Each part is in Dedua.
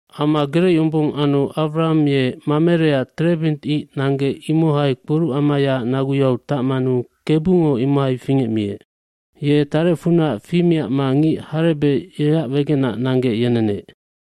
Ama gerec yombong anu Awraham ye Mamereac terebint ic nanggec imohai kporucamayaac naguyau tacmanu Kebungo imohai fingecmiec. aYe tarecfunac fimiacma ngic harebec yeac wegenac nanggec yenenec.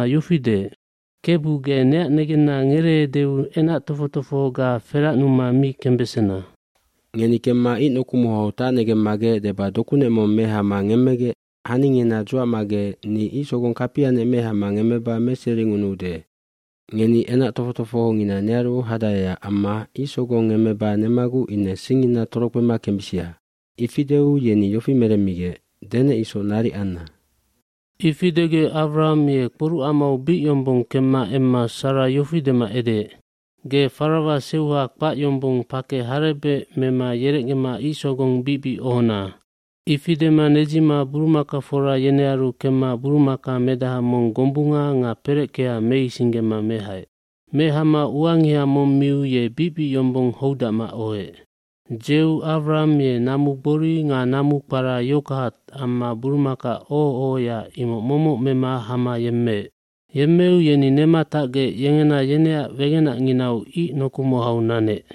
byofi deec, “Kebu, ge neac negenna ngereeudeu enac tofoc tofohoga feracnuma mi kembesena. Ngeni kemma ic nokumahau tacnegemmagec deba dokunec mong mehama ngemmegec haningina dzuacmagec ni icsogong kapianec mehama ngemmeba meseringunuude. Ngeni enac tofoc tofohongina nearu hadaeac amma icsogong ngemmeba nemaguc ine singngina torokpema kembisia.” Ifi deu yeni yofi meremmigec, “Denec isoc naric anna.” Ifi degec Awraham ye kporucamau bic yombong kemma emma Sara yofi dema edeec, “Ge farawa seuha kpac yombong pakec harebec mema yerecgema icsogong bicbic ohona.” Ifi dema nedzima burumakafora yenearu kemma burumaka medaha mong gombunga nga pereckea meisinggema mehaec. Mehama uangiha mong miu ye bicbic yombong houdacma ohoec. Dzeu Awraham ye namu gbori nga namu kpara yoghurtd amma burumaka oho ohoya imoc momoc mema hama yemmeec. Yemmeu yeni nema tacgec yengena yeneac wegenacnginau ic nokumahau nanec.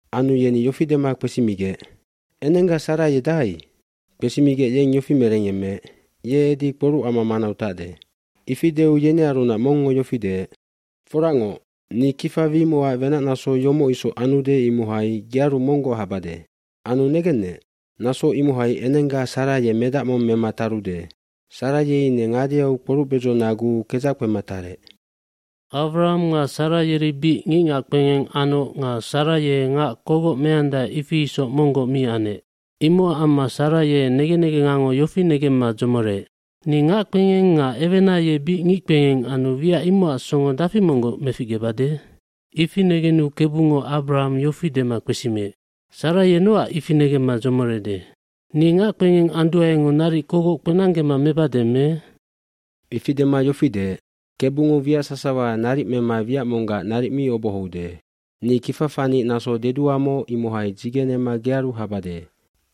Anu yeni yofi dema kpesimigec, “Enengga Sara ye dahai?” Kpesimigec yeng yofi merengyemmeec, “Ye edi kporucama manau tacde.” eIfi deu yenearunac mongngo yofi deec, “Foracngoc, ni kifa wimocac wenacnaso yomoc isoc anude imohai gearu monggoc habade. Anu negennec, naso imohai enengga Sara ye medac mong mema tarude.” Sara ye ine ngadeau kporucbedzonaguu kedzac kpema tarec. Awraham nga Sara yeri bic ngicngac kpengeng anoc nga Sara ye ngac kogoc meandae ifi isoc monggoc mi anec. fImocac amma Sara ye negen negengango yofi negemma dzomoreec, “Ni ngac kpengeng nga ewena ye bic ngic kpengeng anu wiac imocac songo dafi monggoc meficgebade?” Ifi negenu Kebungo Awraham yofi dema kpesimiec, “Sara ye nocac ifi negemma dzomorede, ‘Ni ngac kpengeng anduaengo naric kogoc kpenanggema mebade me?’” gIfi dema yofi deec, “Kebungo wiac sasawa naric mema wiac monggac naric mi obohoude. Ni kifa fanic naso deduamoc imohai dzigenema gearu habade.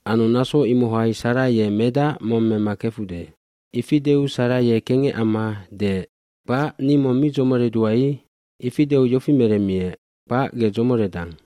Anu naso imohai Sara ye medac mong mema kefude.” Ifi deu Sara ye kengec amma, “Kpac, ni mong mi dzomoredua i.” Ifi deu yofi meremmiec, “Kpac, ge dzomoredang.”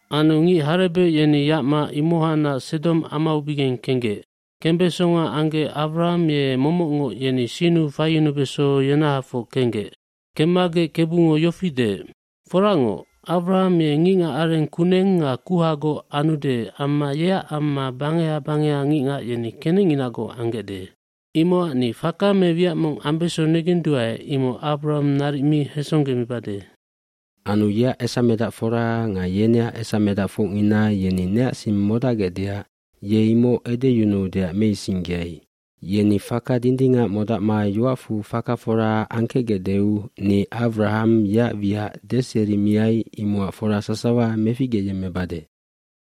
Anu ngic harebec yeni yacma imohacnac Sedom amaubigeng kenggec. Kembesonga anggec Awraham ye momocngoc yeni sinnu faiyunubeso yenahafoc kenggec. Kemmagec Kebungo yofi deec, “Foracngoc, Awraham ye ngicngacareng kuneng nga kuhagoc anude amma yeac amma bangeha bangeha ngicngac yeni kenecnginagoc anggecde. Imocac ni faka me wiac mong ambeso negenduae imoc Awraham naric mi hesonggemibade. hAnu yeac esamedacfora nga yeneac esamedacfocngina yeni neac sing modacgecdeac ye imoc edeyunuudeac meisinggeai. Yeni faka dindingac modacma yoacfu faka fora angkecgecdeu ni Awraham yeac wiac deserimiai imocac fora sasawa meficgeyemmebade.”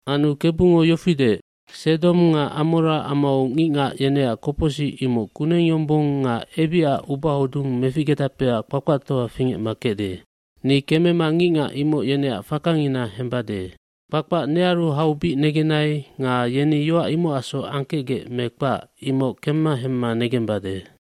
iAnu Kebungo yofi deec, “Sedom nga Amora amau ngicngac yeneac kopocsic imoc kuneng yombong nga ebicac ubahodung meficgedapeac kpakpactoa fingecma kecde. Ni kemema ngicngac imoc yeneac fakangina hembade. Kpakpac nearu hau bic negenai nga yeni yoac imocacsoc angkecgec me kpac, imoc kemma hemma negembade.”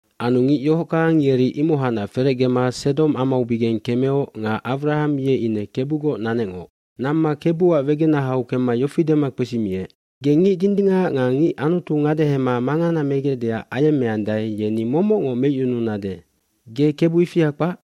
Anu ngic yohockang yeri imohacnac ferecgema Sedom amaubigeng kemeoc nga Awraham ye ine Kebugoc nanecngoc. Namma Kebuac wegenahau kemma yofi dema kpesimiec, “Ge ngic dindingac nga ngic Anutu ngadehema mangana megecdeac ayemmeande yeni momocngoc meicyunudacnade, ge Kebu ifia kpac.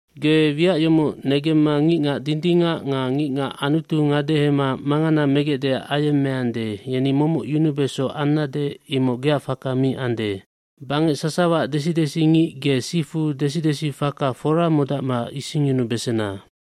jGe wiac yomoc negemma ngicngac dindingac nga ngicngac Anutu ngadehema mangana megecdeac ayemmeande yeni momoc yunubeso annade imoc geac faka mi ande. Bangec sasawaac desi desingic ge sifu desidesifaka fora modacma isingyunubesena.”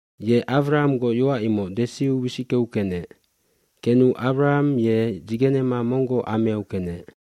Ye Awrahamgoc yoac imoc desiu wisickeu kenec. Kenu Awraham ye dzigenema monggoc ameau kenec.